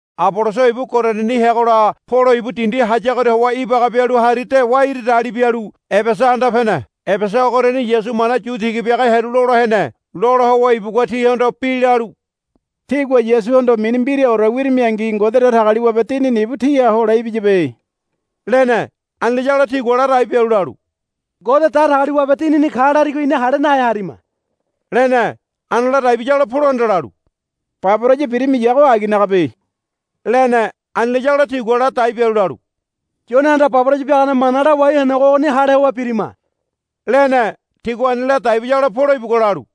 Aboloso ibu Korindini heagola Polo ibu dindi hayagoria howa ibaga bialu hari dewa iri dali bialu pialu Ebesa anda pene. Ebesa ogoriani Yasu mana yu tiga biaga hearu lola hene. Lola howa ibugua tihondo bi lalu, Tígua Yasuhondo mini mbiraore wirimingi Ngode Datagaliwabe Dinini ibu tíha hole ibiyabe, lene. Ani layagola tigua ladai bialu lalu, Ngode Datagaliwabe Dinini ka larigo ina hale nahe harima, lene. Ani ladai biyagola Polohanda lalu, Baboraya birimiyago aginagabe, lene. Ani layagola tigua ladai bialu lalu, Yonehanda baboraya biagane mana lawai henego ogoni hale howa birima, lene. Tigua ani ladai biyagola Polo ibugua lalu,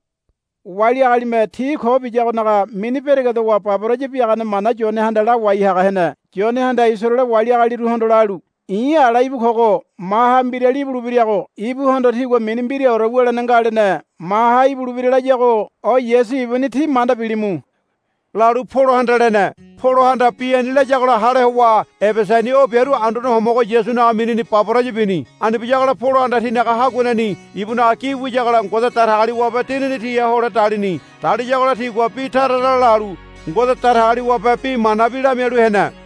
Wali agalime ti ko biyagonaga mini beregedowa baboraya biagane mana Yonehanda lawai haga hene. Yonehanda Isaraele wali agaliruhondo lalu, I̱ ala íbu kogo. Maha mbirali ibulebirago ibuhondo tígua mini mbiraore wulene nga, lene. Maha ibulebira layago o Yasu ibuni tí manda bilimu, lalu Polohanda lene. Polohanda bi ani layagola hale howa Ebesani o biaru Anduane Homogo Yasunaga minini baboraya bini. Ani biyagola Polohanda tinaga haguaneni ibunaga gi wiyagola Ngode Datagaliwabe Dinini tiha hole dalini. Daliyagola tigua bi tara tara lalu Ngode Datagaliwabe bi manabi lamialu hene.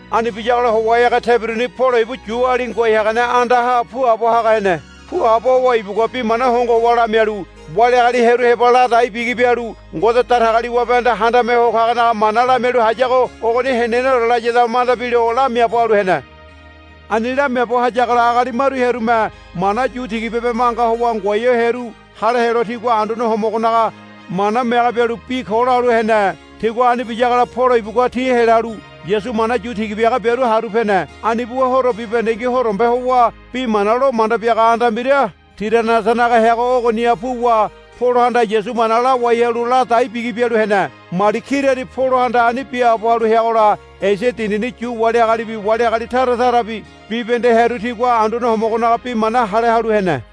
Ani biyagola howa ege tebiruni Polo ibu Yuali ngoai hagane andaha puabo haga hene. Puabo howa ibugua bi mana hongo howa lamialu wali agali hearu heba ladai bigi bialu Ngode Datagaliwabehanda Handame Ho Kagonaga mana lamialu hayago ogoni heneneore layada manda bilo lamiaabo halu hene. Ani lamiaabo hayagola agali maru hearume mana yu tiga bibe manga howa ngoai ho hearu hale helo tigua Anduane Homogonaga Harigani piagane mana mege bialu bi ko lalu hene. Tigua ani biyagola Polo ibugua ti helalu Yasu mana yu tiga biaga biaru haru pene. Ani buwa horo bibahendengi horombe howa bi mana lo manda biaga anda mbira Tiranasanaga heago ogoniha puwa Polohanda Yasu mana lawai halu ladai bigi bialu hene. Mali kirani Polohanda ani biaabo halu heagola Esia dindini Yu wali agalibi wali agali tara tarabi bibahende hearu tigua Anduane Homogonaga bi mana hale halu hene.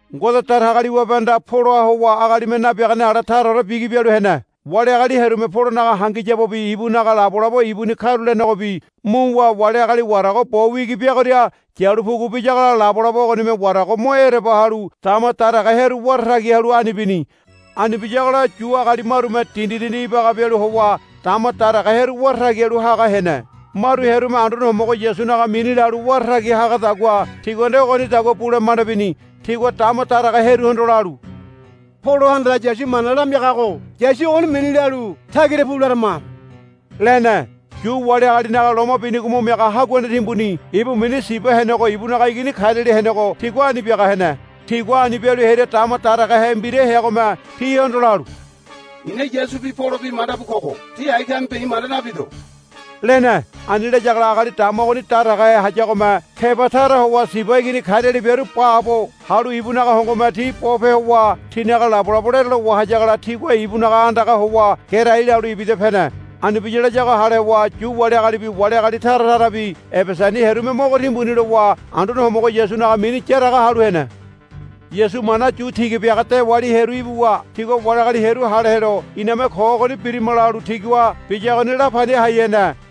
Ngode Datagaliwabehanda Poloha howa agalime nabiagane ale taraore bigi bialu hene. Wali agali hearume Polonaga hangiyabobi ibunaga labolabo ibuni karulenegobi muwa wali agali warago bo wigi biagoria yalu pugu biyagola labolabo ogonime warago mo ereba halu dama daraga hearu wara tagi halu ani bini. Ani biyagola Yu agali marume dindi dindi ibaga bialu howa dama daraga hearu wara tagi halu haga hene. Maru hearume Anduane Homogo Yasunaga mini lalu wara tagi hagadagua tigua nde ogonidagua bule manda bini. Tigua dama daraga hearuhondo lalu, Polohanda Yasu mana lamiagago Yasu ogoni mini lalu tagira pu larama, lene. Yu wali agalinaga loma binigo mo miaga haguane timbuni ibu mini Siba henego ibunaga igini kariali henego tigua ani biaga hene. Tigua ani bialu hearia dama daragahe mbira heagome tihondo lalu, I̱na Yasubi Polobi manda bu kogo. Tí ai kamibe i̱ manda nabido, lene. Ani layagola agali dama ogoni daragahe hayagome keba tara howa Siba igini kariali biaru baabo halu ibunaga hongome ti bope howa tinaga labolabo lerelo wahayagola tigua ibunaga andagaha howa gerai lalu ibida pene. Ani biya layago hale howa Yu wali agalibi wali agali tara tarabi Ebesani hearume mogo timbuni lowa Anduane Homogo Yasunaga mini yaraga halu hene. Yasu mana yu tiga biaga dewali hearu ibuwa tigua wali agali hearu hale helo, Iname ko ogoni birima, lalu tigua biyagoni la pani hai hene.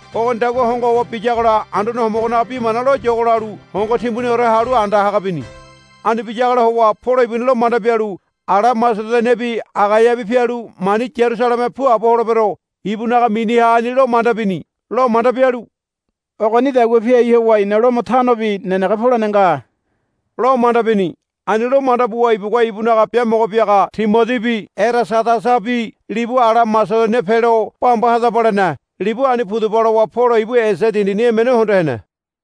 Ogonidagua hongo howa biyagola Anduane Homogonaga bi mana loyogo lalu hongo timbuniore halu anda haga bini. Ani biyagola howa Polo ibuni lo manda bialu, Ala Masedoniabi Agaiabi pialu mani Yarusaleme puabo holebero, ibunaga miniha ani lo manda bini. Lo manda bialu, Ogonidagua piai howa i̱na Lomo tanobi nenege polene nga, lo manda bini. Ani lo manda buwa ibugua ibunaga biamogo biaga Timodibi Erasadasabi libu ala Masedonia pelo, Bamba hadaba, lene. Libu ani pudaba lowa Polo ibu Esia dindini emene hondo hene.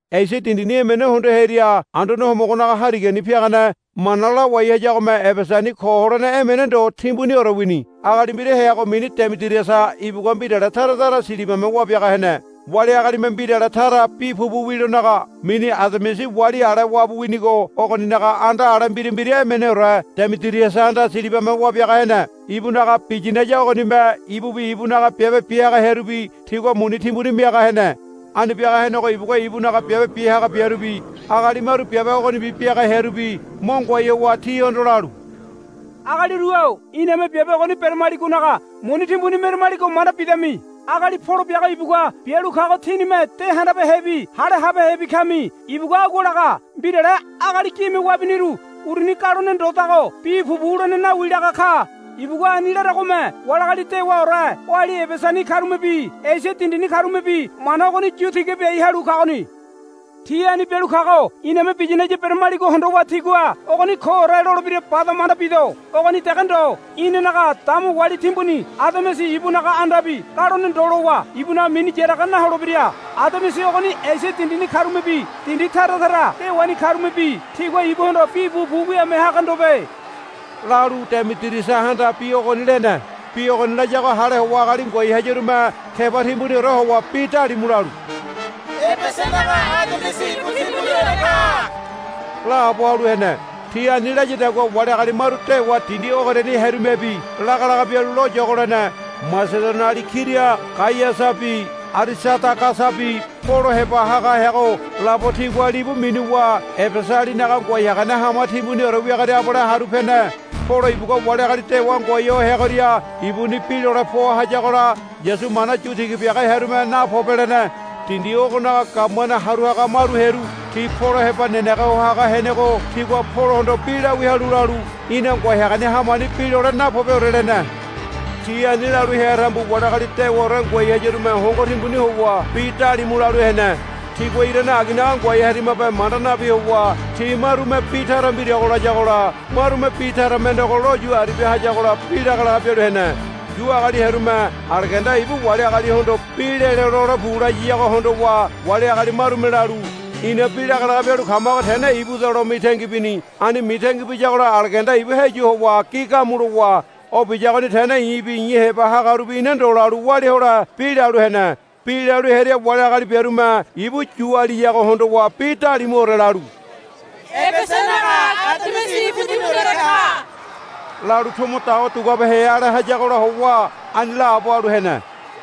Esia dindini emene hondo hearia Anduane Homogonaga Harigani piagane mana lawai hayagome Ebesani ko holene emene ndo timbuniore wini. Agali mbira heago mini Demidiriasa ibugua mbirale tara tara silibame wabiaga hene. Wali agalime mbirale tara bi pupu wilonaga mini Ademisi wali ale wabu winigo ogoninaga anda ale mbira mbira emeneore Demidiriasahanda silibame wabiaga hene. Ibunaga biyinaya ogonime ibubi ibunaga biabe biaga hearubi tigua muni timbuni miaga hene. Ani biaga henego ibugua ibunaga biabe biaga biarubi agali maru biabe ogonibi biaga hearubi mo ngoai howa tihondo lalu, Agaliru-o iname biabe ogoni beramaligonaga muni timbuni meramaligo manda bidami. Agali Polo biago ibugua bialu kago tínime de handabehebi hale habehebi kami. Ibugua agua laga, Mbirale agali gime wabiniru uruni galone ndodago bi pupu wulene nawi, laga ka. Ibugua ani laragome wali agali dewaore oali Ebesani karumebi Esia dindini karumebi mana ogoni yu tiga biai halu kagoni. Ti ani bialu kago iname biyinaya beramaligo hondowa tigua, Ogoni koore, lolebira bada manda bido. Ogoni dege ndo. Inanaga dama wali timbuni Ademisi ibunaga andabi galone ndo lowa ibunaga mini yaraga naholebira. Ademisi ogoni Esia dindini karumebi dindi tara tara dewani karumebi tigua ibuhondo bi pupu wiame haga ndobe, lalu Demidiriasahanda bi ogoni lene. Bi ogoni layago hale howa agali ngoai hayarume keba timbuniore howa bi dalimu lalu, Ebesanaga Ademisi ibu timbuniore ka, laabo halu hene. Ti ani layadagua wali agali maru dewa dindi ogoriani hearumebi lagalaga bialu loyogo lene. Masedoniali kira Gaiasabi Arisadagasabi Polo heba haga heago labo tigua libu minuwa Ebesalinaga ngoai hagane hama timbuniore wiagoria abale haru pene. Polo ibugua wali agali dewa ngoai ho heagoria ibuni bi lole poa hayagola Yasu mana yu tiga biaga hearume, Napobe, lene. Dindi ogonaga gabumane haru haga maru hearu ti Polo heba nenege ho haga henego tigua Polohondo bi lawia halu lalu, Í̠na ngoai hagane hamani bi lole napobeore, lene. Ti ani lalu hea tambu wali agali dewaore ngoai hayarume hongo timbuni howa bi dalimu lalu hene. Tigua irane aginaga ngoai harimabe manda nabi howa ti marume bi tara mbirago layagola marume bi tara mendego lo yu aribia hayagola bi lagalaga bialu hene. Yu agali hearume Aleganda ibu wali agalihondo bi lelo, Lole pu, layiyago hondowa wali agali marume lalu, Ina bi lagalaga bialu kamago tene ibuda, lo mitangi bini. Ani mitangi biyagola Aleganda ibu heyu howa gi gamu lowa, O biyagoni tene i̱bi i̱ heba hagarubi ina ndo, lalu walia hole bi lalu hene. Bi lalu hearia wali agali biarume ibu Yu agaliyago hondowa bi dalimuore lalu, Ebesanaga Ademisi ibu timbuniore ka, lalu tomo dawa duguabehe ale hayagola howa ani laabo halu hene.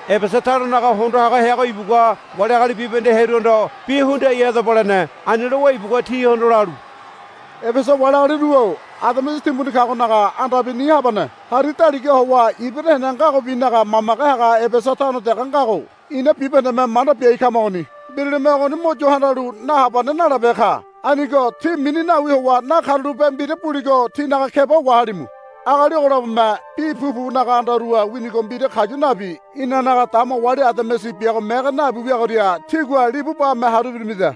Ebesa tanonaga hondo haga heago ibugua wali agali bibahende hearuhondo, Bi hundiai hadaba, lene. Ani lowa ibugua tihondo lalu, Ebesa wali agaliru-o Ademisi timbuni kagonaga andabi ni habane hari daligaha howa ibira hene ngagobinaga mamage haga Ebesa tano dege ngago ina bibahendeme manda biai kamagoni. Mbiralime ogoni mo yo handalu nahabane nalabehe ka. Anigo tí mini nawi howa nakarulape mbira buligo tínaga keba wahalimu. Agali ogo labome bi pupunaga andaruha winigo mbira kayu nabi inanaga dama wali Ademisi biago mege nabi wiagoria tígua libu bame haru ibirimida.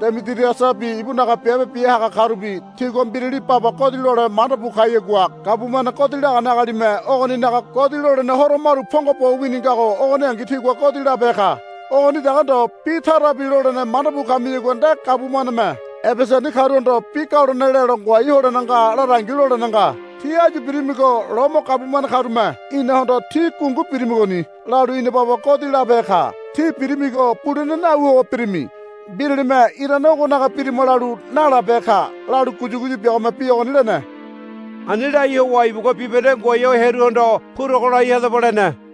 Demidiriasabi ibunaga biabe biaga karubi tigua mbirali baba godi lole manda bu kayagua gabumane godi lagane agalime ogoninaga godi lolene horo maru pongo bo wini ngago ogoningi tigua godi labehe ka. Ogoni dege ndo bi tarabi lolene manda bu kamiyagua nde gabumaneme Ebesani karuhondo, Bi galone lelo ngoai holene nga, larangi lolene nga. Tí áyu birimigo Lomo gabumane karume inahondo, Tí gungu birimigoni, lalu ina baba godi labehe ka. Tí birimigo bulene nawi howa birimi. Mbiralime irane ogonaga birima lalu nalabehe ka, lalu guyuguyu biagome bi ogoni lene. Ani lai howa ibugua bibahende ngoai ho hearuhondo, Purogo lai hadaba, lene.